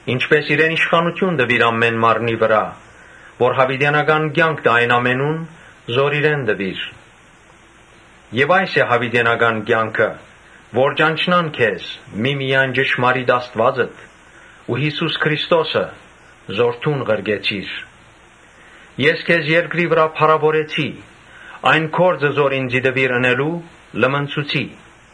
Ինչպէս իրեն իշխանութիւն տուիր ամէն մարմնի վրայ որ յաւիտենական կեանք տայ այն ամենուն զոր իրեն տուիր։ Այս է յաւիտենական կեանքը, որ ճանչնան քեզ միմիայն ճշմարիտ Աստուածդ ու Յիսուս Քրիստոսը, որ դուն ղրկեցիր։ Ես քեզ երկրի վրայ փառաւորեցի, այն գործը որ ինծի տուիր ընելու՝ լմնցուցի։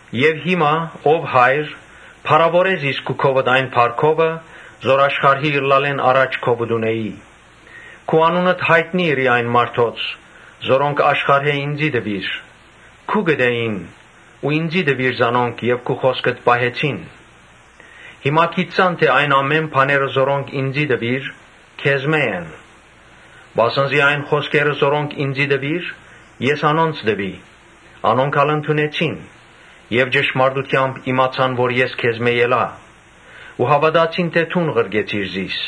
Եւ հիմա, ո՛վ Հայր, փառաւորէ՛ զիս քու քովդ այն փառքովը որ աշխարհի ըլլալէն առաջ քովդ ունէի։ Քու անունդ յայտնի ըրի այն մարդոց, որոնք աշխարհէն ինծի տուիր։ Քուկդ էին ու ինծի տուիր զանոնք եւ անոնք քու խօսքդ պահեցին։ Հիմա գիտցան թէ այն ամէն բաները որոնք ինծի տուիր, քեզմէ են. Վասն զի այն խօսքերը որոնք ինծի տուիր, ես անոնց տուի, անոնք ալ ընդունեցին եւ ճշմարտութեամբ իմացան թէ ես քեզմէ ելայ ու հաւատացին թէ դուն ղրկեցիր զիս։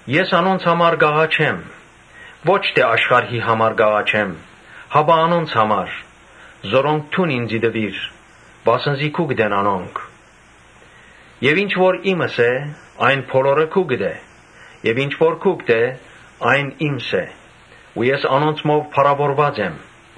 Ես անոնց համար կ’աղաչեմ. ոչ թէ՝ աշխարհին համար, այլ անոնց հանար՝ որ դուն ինծի տուիր, վասն զի քուկդ են անոնք։ Եւ ինչ որ իմս է՝ ան քուկդ է եւ ինչ որ քուկդ է՝ ան իմս է ու ես անոնցմով փառաւորուած եմ։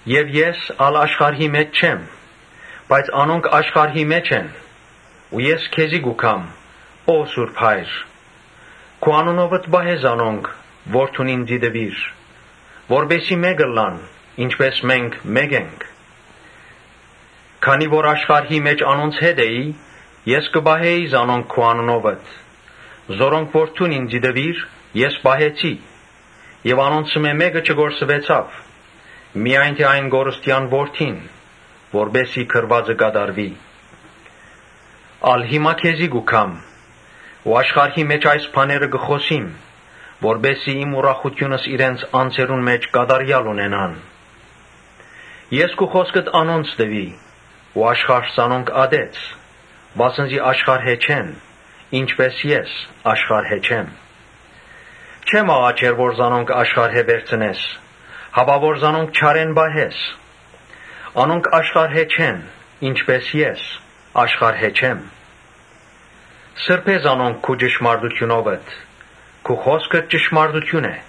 Ես ա՛լ աշխարհի մէջ չեմ, բայց անոնք աշխարհի մէջ են։ Ես քեզի կու գամ, ո՛վ Սուրբ Հայր, քու անունովդ պահէ զանոնք, որ դուն ինծի տուիր, որպէս զի մէկ ըլլան, ինչպէս մենք մէկ ենք։ Երբ ես աշխարհի մէջ անոնց հետ էի, ես կը պահէի զանոնք քու անունովդ։ Անոնք որ դուն ինծի տուիր, ես պահեցի եւ անոնցմէ մէ՛կը չկորսուեցաւ, միայն թէ այն կորստեան որդին, որպէս զի գրուածը կատարուի։ Ա՛լ հիմա քեզի կու գամ։ Աշխարհի մէջ այս բաները կը խօսիմ, որպէս զի իմ ուրախութիւնս իրենց անձերուն մէջ կատարեալ ըլլայ։ Ես քու խօսքդ անոնց տուի ու աշխարհ զանոնք ատեց, վասն զի աշխարհէն չեն, ինչպէս ես աշխարհէն չեմ։ Չեմ աղաչեր որ զանոնք աշխարհէն վերցնես, հապա որ զանոնք չարէն պահես։ Անոնք աշխարհէն չեն, ինչպէս ես աշխարհէն չեմ։ Սրբէ՛ զանոնք քու ճշմարտութիւնովդ։ Քու խօսքդ ճշմարտութիւն է։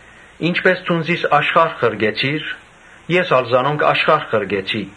Ինչպէս դուն զիս աշխարհ ղրկեցիր, ես ալ զանոնք աշխարհ ղրկեցի։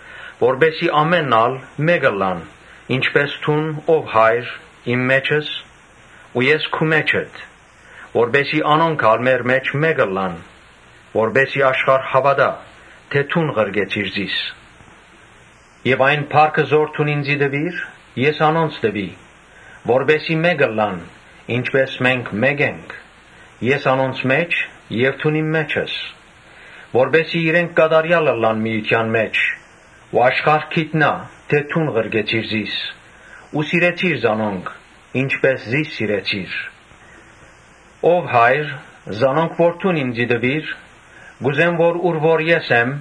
Որպէս զի ամէնքն ալ մէկ ըլլան, ինչպէս դո՛ւն, ո՛վ Հայր, իմ մէջս՝ ու ես քու մէջդ, որպէս զի անոնք ալ մեր մէջ մէկ ըլլան եւ աշխարհ հաւատայ թէ դուն ղրկեցիր զիս։ Այն փառքը որ դուն ինծի տուիր, ես անոնց տուի, որպէս զի մէկ ըլլան՝ ինչպէս մենք մէկ ենք. (Ես՝ անոնց մէջ եւ դուն՝ իմ մէջս.) որպէս զի իրենք կատարեալ ըլլան միութեան մէջ ու աշխարհ գիտնայ թէ դո՛ւն ղրկեցիր զիս ու սիրեցիր զանոնք՝ ինչպէս զիս սիրեցիր։ Ո՛վ Հայր, զանոնք որ դուն ինծի տուիր, կ’ուզեմ որ ուր որ ես ըլլամ,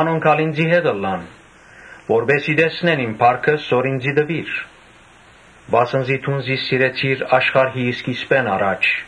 անոնք ալ ինծի հետ ըլլան, որպէս զի տեսնեն իմ փառքս, որ ինծի տուիր. վասն զի դուն զիս սիրեցիր աշխարհի սկիզբէն առաջ։